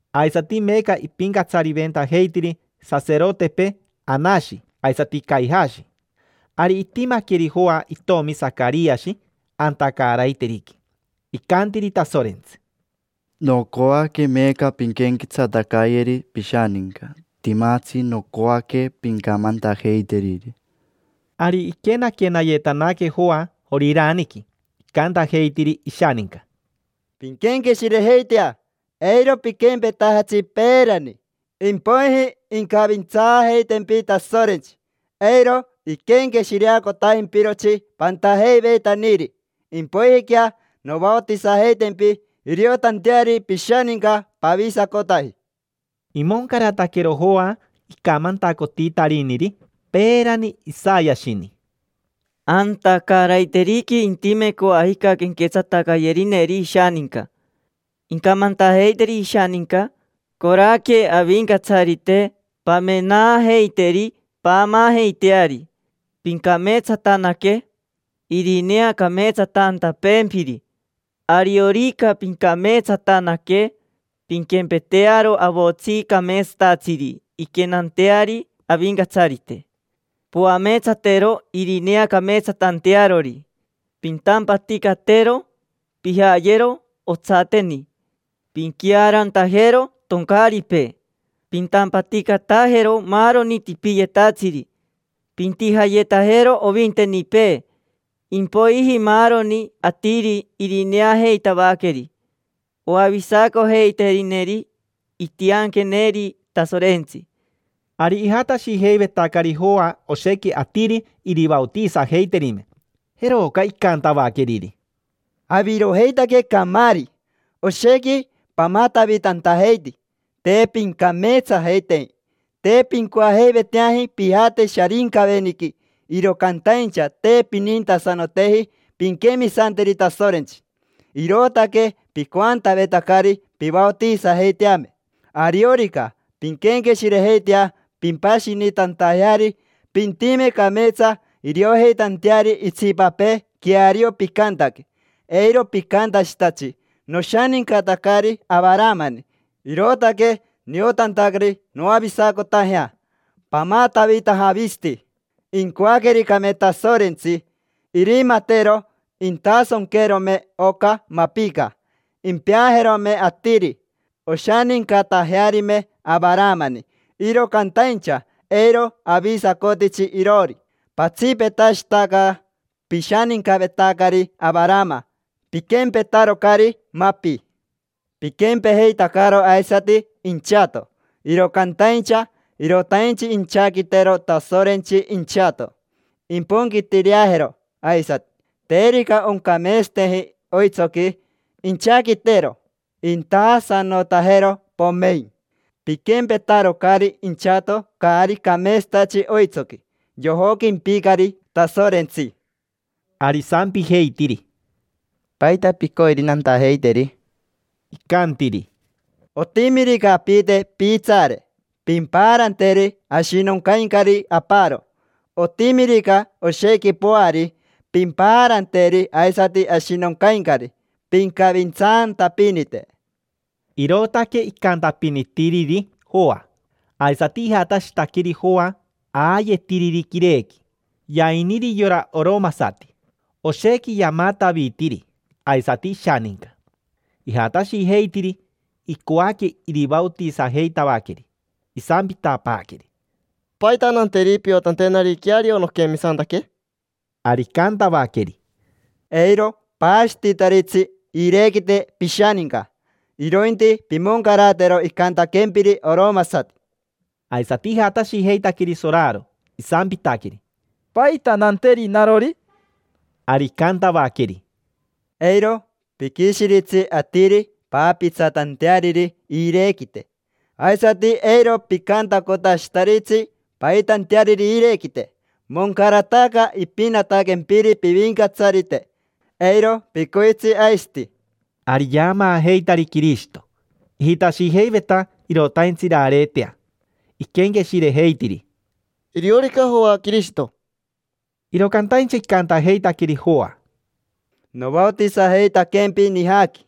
Aisati meeca ipincatsariventajeitiri saserotepee Anashi aisati Caijashi. Ari itimaqueri Joa, itomi Sacariashi, anta caaraiteriqui. Icantiri Tasorentsi: —Nocoaque meeca pinquenquetsatacayeri pishaninca, timatsi nocoaque pincamantajeiteriri. Ari iquenaquenayetanaque Joa Joriraniqui, icantajeitiri ishaninca: —Pinquenqueshirejeitea, eiro piquempetajatsi peerani, impoiji incavintsaajeitempi Tasorentsi: eiro iquenqueshireacotajimpirotsi pantajeiveitaniri. Impoijiquea novaotisajeitempi iriotanteari pishaninca pavisacotaji. Imoncarataquero Joa icamantacotitariniri peerani Isayashini: “Anta caaraiteriqui intime coajica quenquetsatacayerineri ishaninca. Incamantajeiteri ishaninca: ‘Coraque Avincatsarite, pamenaajeiteri, paamaajeiteari. Pincameetsatanaque irineacameetsatantapeempiri. Ariorica pincameetsatanaque, pinquempetearo avotsi cameetsatatsiri inquenanteari Avincatsarite: poameetsatero irineacameetsatantearori. Pintampaticatero, pijayero otsateni, pinquiaarantajero toncaaripee, pintampaticatajero maaroni tipiyetatsiri, pintijayetajero ovintenipee. Impoiji maaroni atiri irineajeitavaqueri oavisacojeiterineri intianqueneri Tasorentsi’”. Ari ijatashijeivetacari Joa oshequi atiri irivaotisajeiterime. Jeroca icantavaqueriri: —Avirojeitaque camaari: oshequi pamatavitantajeiti, te pincameetsajeiteji. Te pincoajeiveteaji pijate Sharincaveniqui, iro cantaincha te pinintasanoteji pinquemisanteri Tasorentsi, irootaque picoantavetacari pivaotisajeiteame. Ariorica pinquenqueshirejeitea pimpashinitantajeari, pintime cameetsa iriojeitanteari itsipapee queario picantaque. Eiro picantashitatsi: “Noshanincatacari Avaramani, irootaque niotantacari noavisacotajea”. Pamatavitaja avisati. Incoaquericame Tasorentsi, irimatero intasonquerome oca mapica, impeajerome atiri, oshanincatajearime Avaramani, iro cantaincha eiro avisacotitsi iroori. Patsipetashitaca pishanincavetacari Avarama: piquempetarocari mapi. Piquempejeitacaro aisati inchato. Iro cantaincha irotaintsi inchaquitero Tasorentsi inchato, imponquitireajero aisati. Terica oncameetsateji oitsoqui, inchaquitero, intaasanotajero, pomein. Piquempetarocari inchato caari cameetsatatsi oitsoqui: yojoquimpicari Tasorentsi. Ari isampijeitiri: —¿Paita picoiri nantajeiteri? Icantiri: —Otimirica apite piitsaare, pimpaaranteri ashinoncaincari aparo. Otimirica oshequi poari, pimpaaranteri aisati ashinoncaincari. Pincavintsaantapinite. Irootaque icantapinitiriri Joa. Aisati ijatashitaqueri Joa aayetiriri quirequi: yainiri yora oromasati, oshequi yamatavitiri aisati ishaninca. Ijatashijeitiri, icoaque irivaotisajeitavaqueri, isampitapaaqueri: —¿Paita nanteri piotantenari queario noquemisantaque? Ari icantavaqueri: —Eiro paashititaritsi iirequite pishaninca, irointi pimoncaratero icantaquempiri oromasati. Aisati ijatashijeitaqueri soraro, isampitaqueri: —¿Paita nanteri narori? Ari icantavaqueri: —Eiro piquishiritsi atiri paapitsatanteariri iirequite, aisati eiro picantacotashitaritsi paitanteariri iirequite. Moncarataca ipinataquempiri pivincatsarite, eiro picoitsi aisati. Ari yaamaajeitari Quirishito, ijitashijeiveta irotaintsi irareetea. Iquenqueshirejeitiri: “Iriorica Joa Quirishito”. Iro cantaincha icantajeitaqueri Joa: —Novaotisajeitaquempi nijaqui: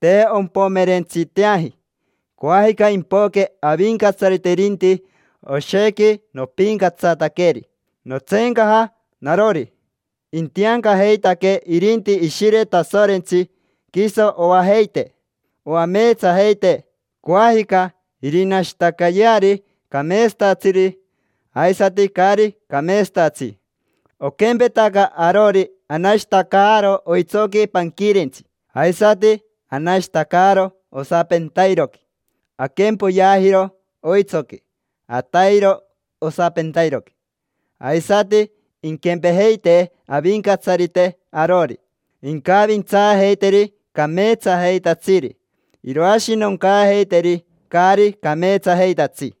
te ompomerentsiteaji. Coajica impoque Avincatsarite irinti, oshequi nopincatsataqueri, notseencaja narori. Intiancajeitaquee irinti Ishire Tasorentsi, quiso oajeitee, oameetsajeitee. Coajica irinashitacayeari cameetsatatsiri aisati caari cameetsatatsi. Oquempetaca arori anashitacaaro oitsoqui panquirentsi, aisati anashitacaaro osapentairoqui. Aquempoyeajiro oitsoqui, atairo osapentairoqui. Aisati inquempejeitee Avincatsarite arori: incavintsaajeiteri cameetsajeitatsiri, iroashinoncaajeiteri caari cameetsajeitatsi.